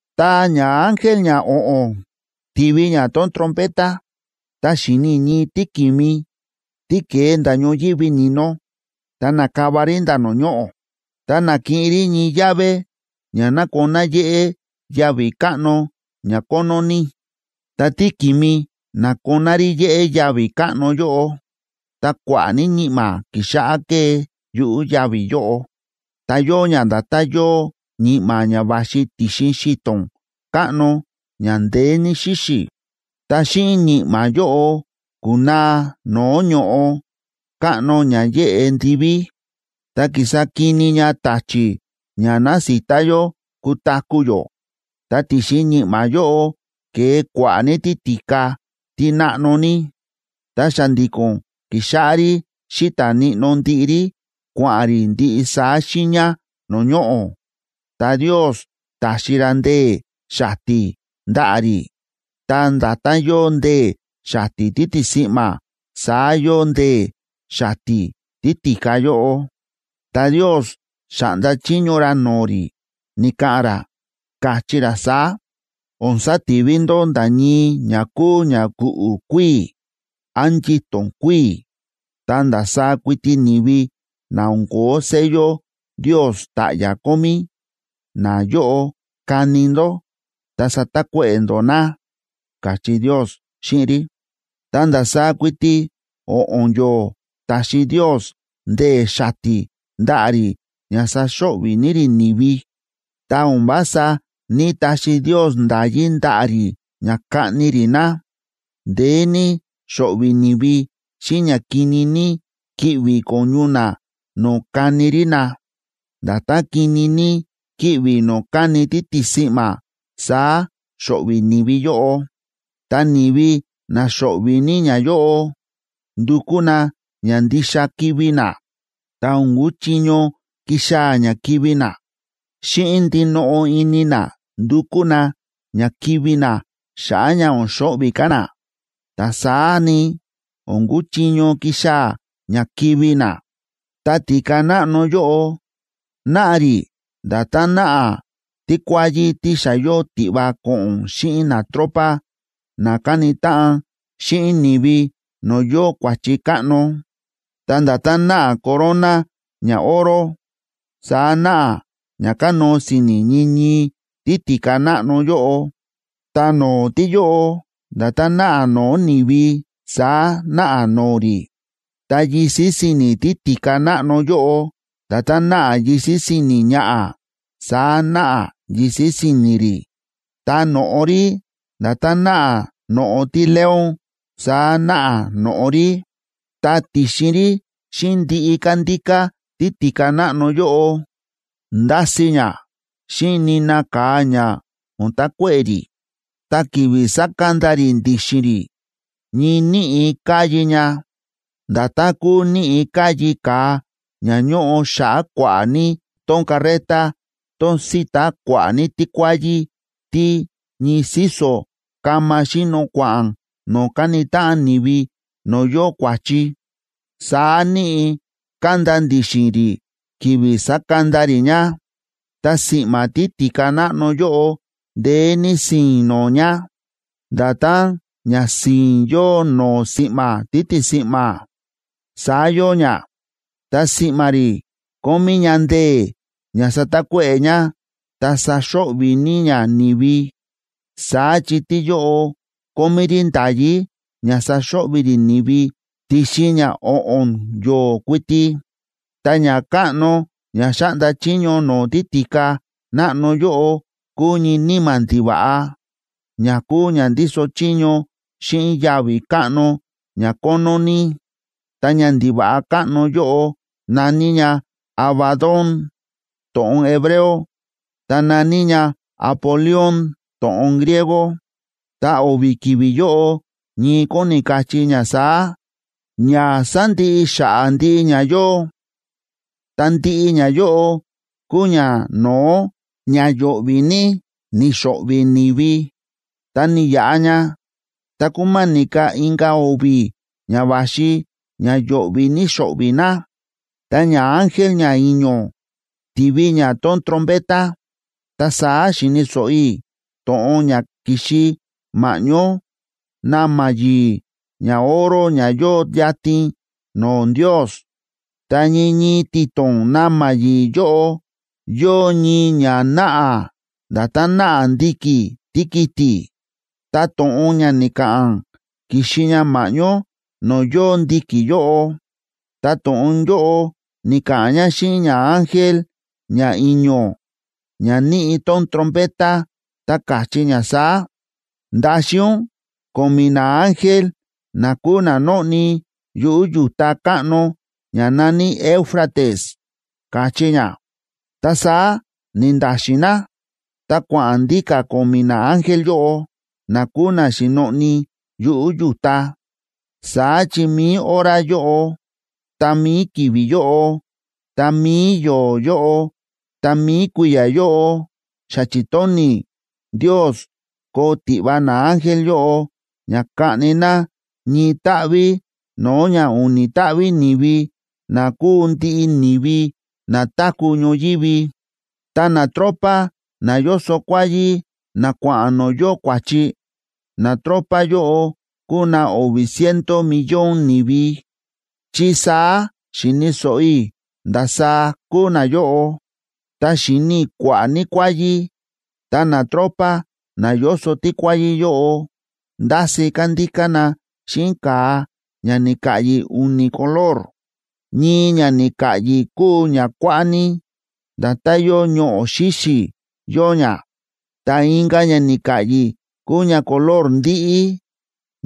Ta ñaángel ñao̱ꞌo̱n ti̱vi ña tón trompeta, ta xi̱ni i̱ ñii tíki̱mi, tí ke̱e nda̱ ñoyívi ni̱no, ta na̱kava rí nda̱ no̱o̱ ñoꞌo̱. Ta na̱kiꞌin rí ñii llave ña nakoná yéꞌé yavi̱ káꞌno ña kónó ní. Ta tíki̱mi na̱koná rí yéꞌé yavi̱ káꞌno yóꞌo, ta kua̱ꞌa̱ ní ñi̱ꞌma̱ ki̱xáꞌá kée yuꞌu̱ yavi̱ yóꞌo. Ta yóo ña nda̱tán yóo ñi̱ꞌma̱ ña va̱xi ti̱xin xi̱to̱n káꞌno ña ndeé ní xíxi̱. Ta xíꞌin ñi̱ꞌma̱ yóꞌo ku̱naa no̱o̱ ño̱ꞌo káꞌno ña yéꞌe ndiví, ta ki̱sa kini ña ta̱chi̱ ña násita yó kutaku̱ yó. Ta ti̱xin ñi̱ꞌma̱ yóꞌo ke̱e kua̱ꞌa̱ ní títi̱ka tí náꞌno ní. Ta xa̱ndi̱ko̱n ki̱xáꞌá rí xíta̱ níꞌnó ndiꞌi rí, kua̱ꞌa̱n rí ndiꞌi saá xiiña no̱o̱ ñoꞌo̱. Ta Ndios ta̱xi ra ndee̱ xati̱ ndaꞌa̱ rí. Ta nda̱tán yóo ndee̱ xati̱ títisi̱ꞌma̱, saá yóo ndee̱ xati̱ títi̱ka yóꞌo. Ta Ndios xa̱ꞌnda chiño ra no̱o̱ rí, ni̱ka̱ꞌa̱n ra, káchí ra saá: ―O̱n sativi ndó nda̱ ñii ña kúu ña ku̱ꞌu̱ kuíi̱, án yito̱n kuíi̱. Ta ndasaá kuiti ni̱vi na o̱n ko̱ó sello Ndios ta̱ꞌya̱ kómí, nayóꞌo kani ndó ta satakuéꞌe̱ ndó na ―káchí Ndios xíꞌin rí. Ta ndasaá kuiti o̱ꞌo̱n yo̱o̱ ta̱xi Ndios ndee̱ xati̱ ndaꞌa̱ rí ña saxo̱ꞌvi̱ ní rí ni̱vi. Ta o̱n vása ní‑taxi Ndios nda̱yí ndaꞌa̱ rí ña kaꞌni rí na. Ndeé ní xo̱ꞌvi̱ ni̱vi xíꞌin ña kini ní kíꞌvi̱ ko̱ñu na no̱o̱ káni rí na. Nda̱tán kini ní kíꞌvi̱ no̱o̱ káni títisi̱ꞌma̱, saá xo̱ꞌvi̱ ni̱vi yóꞌo. Ta ni̱vi na xo̱ꞌvi̱ ní ñayóꞌo, ndukú na ña ndixa kivi̱ na, ta o̱n kuchiño kixaa̱ ña kivi̱ na. Xíꞌin ndinoꞌo ini na ndukú na ña kivi̱ na xa̱ꞌa̱ ña o̱n xo̱ꞌvi̱ ka̱ na, ta saá ni, o̱n kuchiño kixaa̱ ña kivi̱ na. Ta títi̱ka náꞌno yóꞌo, náꞌa rí nda̱tán náꞌa tíkuáyí tí xa yóo tiꞌva ko̱ꞌo̱n xíꞌin natropa na káni táꞌan xíꞌin ni̱vi no̱o̱ yóo kua̱chi káꞌno. Ta nda̱tán náꞌa corona ñaoro, saá náꞌa ña kánóo si̱ni̱ ñii ñii títi̱ka náꞌno yóꞌo. Ta no̱o̱ tíyóꞌo, nda̱tán náꞌa no̱o̱ ni̱vi, saá náꞌa no̱o̱ rí. Ta yisi̱ si̱ni̱ títi̱ka náꞌno yóꞌo, nda̱tán náꞌa yisi̱ si̱ni̱ ñaꞌa̱, saá náꞌa yisi̱ si̱ni̱ rí. Ta no̱ꞌo rí, nda̱tán náꞌa no̱ꞌo tíleón, saá náꞌa no̱ꞌo rí. Ta ti̱xin rí xíꞌin ndiꞌi kándíká títi̱ka náꞌno yóꞌo, ndási ña xíꞌin nina ka̱a ña o̱n takuéꞌe̱ rí. Ta ki̱vi̱ sákanda rí ndi̱xi̱n rí, ñii níꞌi̱ káyi ña, nda̱tán kúu níꞌi̱ káyi ka̱a ña ñóꞌo xa̱ꞌa̱ kua̱ꞌa̱ ní tón carreta tón síta kua̱ꞌa̱ ní tíkuáyí tí ñii síso̱ kama xíno kua̱ꞌa̱n no̱o̱ káni táꞌan ni̱vi no̱o̱ yóo kua̱chi, saá níꞌi̱ kánda ndi̱xi̱n rí ki̱vi̱ sákanda rí ña. Ta si̱ꞌma̱ títi̱ka náꞌno yóꞌo, ndeé ní si̱i̱n no̱o̱ ña, nda̱tán ña si̱i̱n yóo no̱o̱ si̱ꞌma̱ títisi̱ꞌma̱, saá yóo ña. Ta si̱ꞌma̱ rí kómí ña ndee̱ ña satakuéꞌe̱ ña ta saxo̱ꞌvi̱ ní ña ni̱vi. Saá chi tíyóꞌo kómí rí nda̱yí ña saxo̱ꞌvi̱ rí ni̱vi ti̱xin ña o̱ꞌo̱n yo̱o̱ kuiti. Ta ñakáꞌno ña xáꞌnda chiño no̱o̱ títi̱ka náꞌno yóꞌo kúu ñii níma̱ ndiva̱ꞌa, ña kúu ña ndíso chiño xíꞌin yavi̱ káꞌno ña kónó ní. Ta ñandiva̱ꞌa káꞌno yóꞌo na̱ní ña Abadón, to̱ꞌon hebreo, ta na̱ní ña Apolión to̱ꞌon griego, ta o̱vi̱ ki̱vi̱ yóꞌo ñii kóni kachí ña saá: Ña sándiꞌi xa̱ꞌa̱ ndiꞌi ña yóo. Ta ndiꞌi ñayóꞌo kúu ñano̱ó ña yo̱ꞌvi̱ ní ni̱xo̱ꞌvi̱ ni̱vi. Ta ni̱yaꞌa ña, ta kúma̱ni̱ ka̱ inka̱ o̱vi̱ ña va̱xi ña yo̱ꞌvi̱ ní xo̱ꞌvi̱ na. Ta ñaángel ñai̱ño̱ ti̱vi ña tón trompeta, ta saá xi̱ni̱ so̱ꞌo i̱ to̱ꞌon ña ki̱xi ma̱ꞌñó na̱ma̱ yi̱i̱ ñaoro ña yóo yatin no̱o̱ Ndios. Ta ñii ñii ti̱to̱n na̱ma̱ yi̱i̱ yóꞌo yóo ñii ña náꞌa nda̱tán náꞌa ndi̱ki̱ tíkiti̱, ta to̱ꞌon ña ni̱ka̱ꞌa̱n ki̱xi ña ma̱ꞌñó no̱o̱ yóo ndi̱ki̱ yóꞌo. Ta to̱ꞌon yóꞌo ni̱ka̱ꞌa̱n ña xíꞌin ñaángel ñai̱ño̱, ña níꞌi tón trompeta, ta káchí ña saá: ―Ndaxin ún ko̱mi̱ naángel na kúu na nóꞌni yuꞌu̱ yu̱ta káꞌno ña na̱ní Éufrates ―káchí ña. Ta saá ni̱nda̱xi̱n na, ta kua̱ꞌa̱n ndíka̱ ko̱mi̱ naángel yóꞌo, na kúu na xi̱noꞌni yuꞌu̱ yu̱ta. Saá chi mi̱i hora yóꞌo, ta mi̱i ki̱vi̱ yóꞌo, ta mi̱i yo̱o̱ yóꞌo, ta mi̱i kui̱ya̱ yóꞌo, xa chi̱tóni̱ Ndios koo tiꞌva naángel yóꞌo ña kaꞌni na ñii táꞌví no̱o̱ ña u̱ni̱ táꞌví ni̱vi na kúu ndiꞌi ni̱vi na táku̱ ñoyívi. Ta natropa na yóso kuáyí na kua̱ꞌa̱n no̱o̱ yóo kua̱chi, natropa yóꞌo kúu na o̱vi̱ ciento millón ni̱vi, chi saá xi̱ni̱ so̱ꞌo i̱ ndasaá kúu nayóꞌo. Ta xi̱ni i̱ kua̱ꞌa̱ ní kuáyí, ta natropa na yóso tíkuáyí yóꞌo, ndási kándíká na xíꞌin ka̱a ña ni̱ka̱ꞌyi̱ u̱ni̱ color. Ñii ña ni̱ka̱ꞌyi̱ kúu ña kuáꞌá ní, nda̱tán yóo ñoꞌo̱ xíxi̱, yóo ña. Ta inka̱ ña ni̱ka̱ꞌyi̱ kúu ña color ndíꞌí,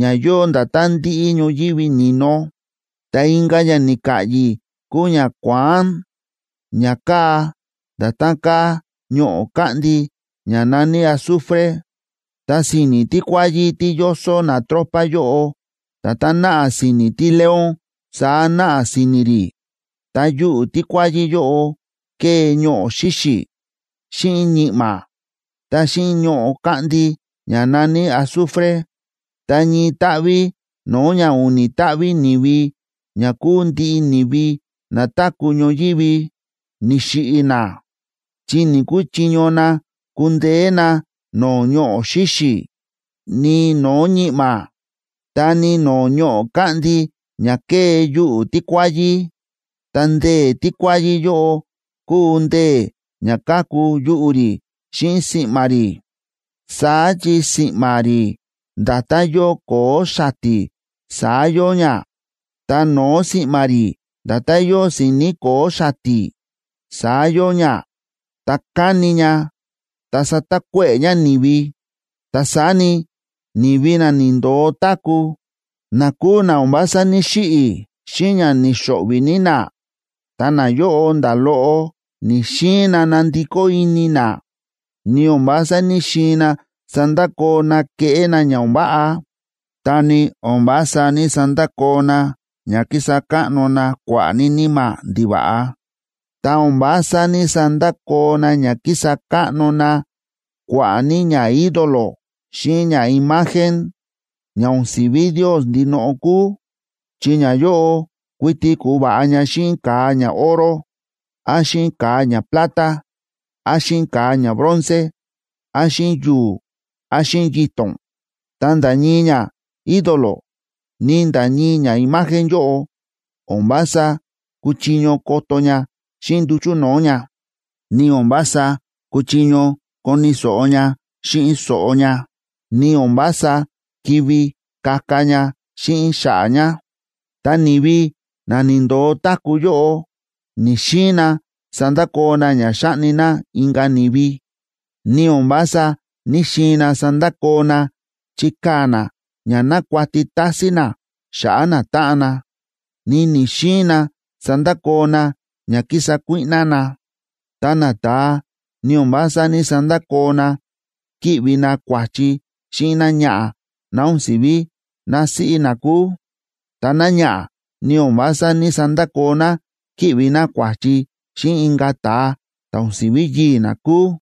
ña yóo nda̱tán ndíꞌí ñoyívi ni̱no. Ta inka̱ ña ni̱ka̱ꞌyi̱ kúu ña kuáán, ña káa nda̱tán káa ñoꞌo̱ káꞌndi ña na̱ní azufre. Ta si̱ni̱ tíkuáyí tí yóso natropa yóꞌo, nda̱tán náꞌa si̱ni̱ tíleón saá náꞌa si̱ni̱ rí. Ta yuꞌu̱ tíkuáyí yóꞌo ke̱e ñoꞌo̱ xíxi̱, xíꞌin ñi̱ꞌma̱, ta xíꞌin ñoꞌo̱ káꞌndi ña na̱ní azufre. Ta ñii táꞌví no̱o̱ ña u̱ni̱ táꞌví ni̱vi ña kúu ndiꞌi ni̱vi na táku̱ ñoyívi, ni̱xiꞌi̱ na, chi ni̱‑kuchiño na kundeé na no̱o̱ ñoꞌo̱ xíxi̱, ni no̱o̱ ñi̱ꞌma̱, ta ni no̱o̱ ñoꞌo̱ káꞌndi ña ke̱e yuꞌu̱ tíkuáyí. Ta ndee̱ tíkuáyí yóꞌo kúu ndee̱ ña káku yuꞌu̱ rí xíꞌin si̱ꞌma̱ rí. Saá chi si̱ꞌma̱ rí nda̱tán yóo ko̱o̱ xati̱, saá yóo ña, ta no̱o̱ si̱ꞌma̱ rí nda̱tán yóo si̱ni̱ ko̱o̱ xati̱, saá yóo ña, ta káni ña ta sátakuéꞌe̱ ña ni̱vi. Ta saá ni, ni̱vi na ni̱ndo̱o táku̱, na kúu na o̱n vása ní‑xiꞌi̱ xíꞌin ña ni̱xo̱ꞌvi̱ ní na, ta nayóꞌo nda̱ loꞌo ni̱‑xiin na nandikó ini na, ni o̱n vása ní‑xiin na sandakoo na kéꞌé na ña o̱n váꞌa. Ta ni o̱n vása ní‑sandakoo na ña kísa káꞌno na kua̱ꞌa̱ ní níma̱ ndiva̱ꞌa, ta o̱n vása ní‑sandakoo na ña kísa káꞌno na kua̱ꞌa̱ ní ñaídolo xíꞌin ñaimagen, ña o̱n si̱ví Ndios ndinoꞌo kúu, chi ñayóꞌo kuiti ku̱va̱ꞌa ña xíꞌin ka̱a ñaoro, án xíꞌin ka̱a ñaplata, án xíꞌin ka̱a ñabronce, án xíꞌin yu̱u̱, án xíꞌin yito̱n. Ta nda̱ ñii ñaídolo ni nda̱ ñii ñaimagen yóꞌo, o̱n vása kúchiño koto ña xíꞌin nduchu̱ no̱o̱ ña, ni o̱n vása kúchiño koni̱ so̱ꞌo ña xíꞌin so̱ꞌo ña, ni o̱n vása ki̱ví kaka ña xíꞌin xa̱ꞌa̱ ña. Ta ni̱vi na ni̱ndo̱o táku̱ yóꞌo, ni̱‑xiin na sandakoo na ña xáꞌni na inka̱ ni̱vi, ni o̱n vása ní‑xiin na sandakoo na chíkaa̱ na ña nákuati tásín na xa̱ꞌa̱ natáꞌan na, ni ni̱‑xiin na sandakoo na ña kísa kuíꞌná na. Ta nata̱a, ni o̱n vása ní‑sandakoo na kíꞌvi na kua̱chi xíꞌin náñaꞌa̱ ná o̱n si̱ví násíꞌí na kúu. Ta náñaꞌa̱, ni o̱n vása ní‑sandakoo ná kíꞌvi ná kua̱chi xíꞌin inka̱ ta̱a ta̱ o̱n si̱ví yii̱ ná kúu.